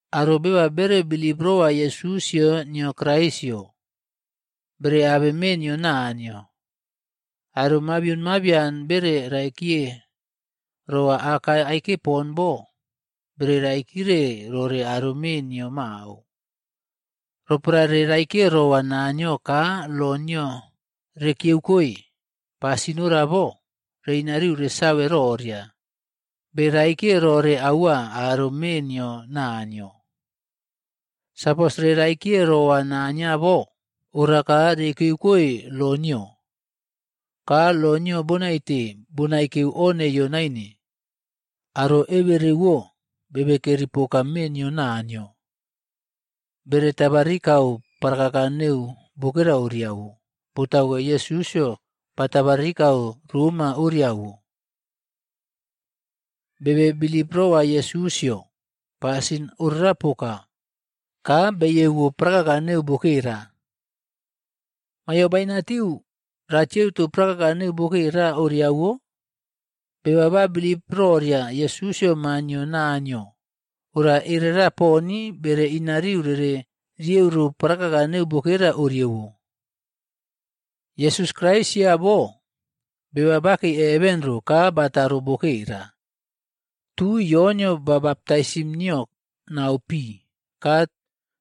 Aro beba bere bilip rowa Yesusꞌyo nio Kraisꞌyo, bere abe mee nio Naniyo. Aro mabion mabian bere raikiye rowa aka aike poka bo, bere raikire rore aro mee nio mao. Roporae reraikiye rowa Naniyo ka lo nio rekiyeukoe, pasin ora bo, reꞌinariu resave roria, beraikiye rore aua aro mee nio Naniyo. Sapos re raikiye rowa Naniyo bo, oraka rekiyukoe lo nio. Ka lo nio bonaite bonaekeu o neiyo naine. Aro eberewo bebekeri poka mee nio Naniyo, bere tabarikau parakaka neu bokera oriawo, botauke Yesusꞌyo batabarikau roma oriawo. Bebe bilip rowa Yesusꞌyo, pasin orakpoka, ka beiyeuwo prakaka neu bokera. Mayo bainatiu ratieuto prakaka neu bokera oriawo? Beba ba bilip roria Yesusꞌyo maa nio Naniyo, aro erera poni bere inariu rere rieuro prakaka neu bokera oriawo. Yesus Kraisꞌyo bo, beba bakei heven ro ka bataro bokera. Tui Yonꞌyo ba baptaisim nio nau pi, ka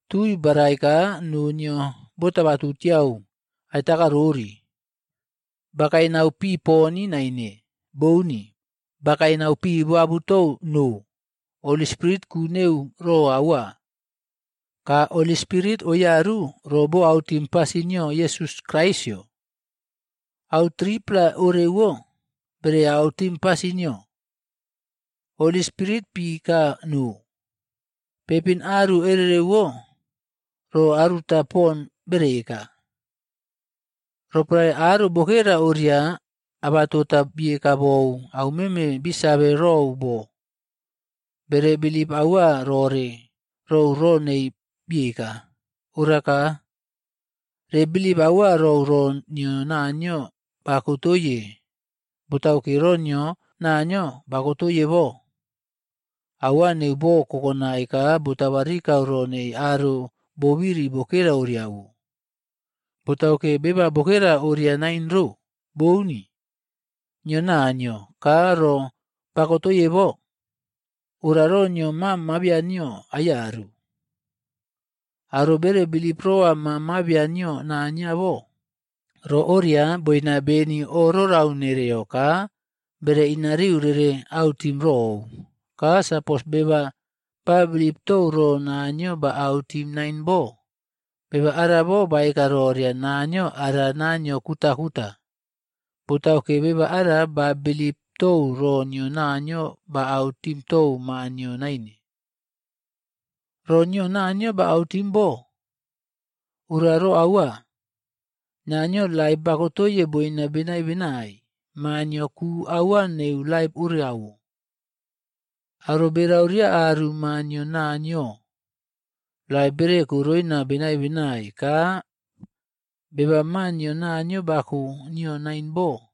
tui barai ka noo nio botabatu tiau aiꞌtakarori. Bakae nau pi poni naine. Bouni. Bakae nau pi boabutou noo. Holy Spirit ku neu ro aua, ka Holy Spirit oiyaru ro boautim pasin nio Yesus Kraisꞌyo. Au 3-pla orewo bere autim pasin nio. Holy Spirit pi ka noo. Peipinaru ererewo ro aruta poni bere eka. Roporae aro bokera oria abatota bieka bou aumeme bisave rou bo, bere bilip aua rore rou ro nei bieka. Oraka re bilip aua rou ro nio Naniyo bakotoiye. Botauke ro nio Naniyo bokotoiye bo, aua neu bo kokonai ka botabarikau ro nei aro bobiri bokera oriawo. Botauke beba bokera oria nain ro. Bouni, nio Naniyo ka ro bakotoye bo, ora ro nio Maa mabian nio aiyaru. Aro bere bilip rora Maa Mabian nio Naniyo bo, ro oria boina beni oꞌrorau nereo ka bere inariu rere autim rou. Ka sapos beba ba bilip tou ro Naniyo ba autim nain bo, beba arabo baeka roria Naniyo ara Naniyo kutakuta. Botauke beba ara ba bilip tou ro nio Naniyo ba autim tou Maa nio naine. Ro nio Naniyo bautim bo, ora ro aua: Naniyo laip bakotoiye boina benai benai. Maa nio ku aua neu laip orawo. Aro berauriya aru Maa nio Naniyo, laip bereko roina benai benai. Ka beba Maa nio Naniyo bako nio naine bo,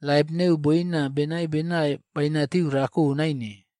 laip neu boina benai benai bainatiu rako naine.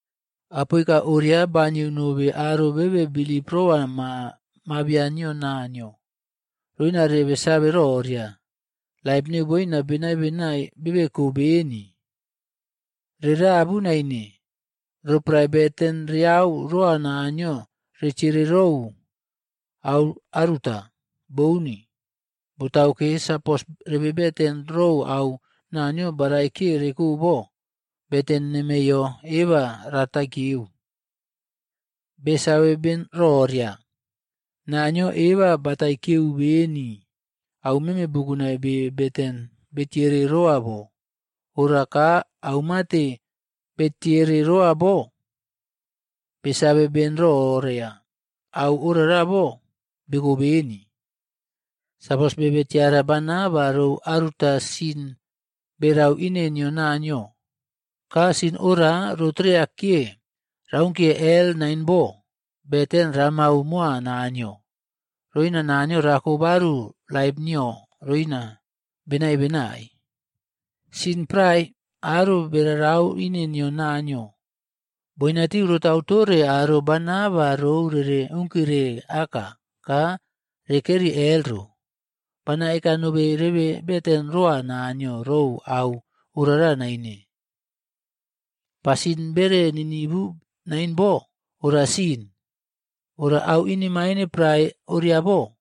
Apoika oria banieu nobe aro bebe bilip roa Maa Mabian nio Naniyo, roina rebe save roria, laip neu boina benai benai bebeko beni. Rerabu naine roporae beten reyau roa Naniyo retiere rou au aruta. Bouni. Botauke, sapos rebeten rou au Naniyo baraikiye reko bo, beten nemeyo eba rataiyekiyeu. Besave beni roria, Naniyo eba bataiyekiyeu beni aumeme bukunai be beten betiere roa bo. Ora ka aumate betiere rowa bo, besave ben roria au orabo beko beni. Sapos bebe tiara bana ba rou aruta sin berau ine nio Naniyo, ka sin ora rotreyakiya raunkiye hel naine bo, beten ramau moa Naniyo, roina Naniyo rako baru laip nio roina benai benai. Sin prae aro berarau ine nio Naniyo, boinatiu rotau tore aro bana ba rou rere unkire aka ka rekeri hel ro. Bana eka nobe rebe beten roa Naniyo rou au orara naine. Pasin bere ninivu naine bo, ora sin. Ora au inemaine prae oriabo,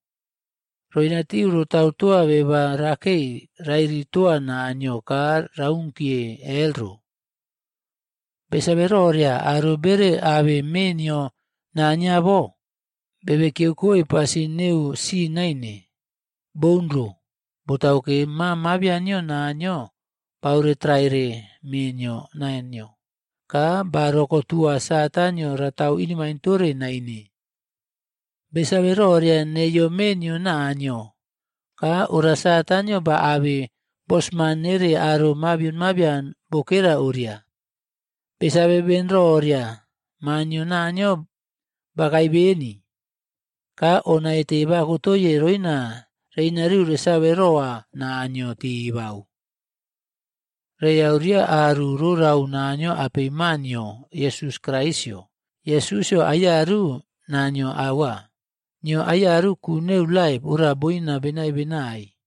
roina tiu rotau toa beba rakei rairi toa Naniyo ka raunkiye hel ro. Besave roria aro bere abe mee nio Naniyo bo, bebe kiyeukoe pasin neu sin naine. Boun ro. Botauke, Maa Mabian nio Naniyo baoretraire mee nio Naniyo, ka ba rokotua Satanꞌyo ratau inemaine tore naine. Besave roria neiyo mee nio Naniyo, ka ora Satanꞌyo baꞌabe bosman nere aro mabion mabian bokera oria. Besave ben roria, Maa nio Naniyo bakae beni, ka o naite bakotoiye roina reꞌinariu resave roa Naniyo teba. Reyau ria aru rorau Naniyo apei Maa nio Yesus Kraisꞌyo. Yesusꞌyo aiyaru Naniyo aua, nio aiyaru ku neu laip ora boina benai benai.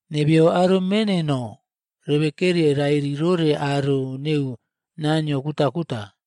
Nebeyo aro mee neno, rebe keri rairi rore aro neu naniyo kutakuta.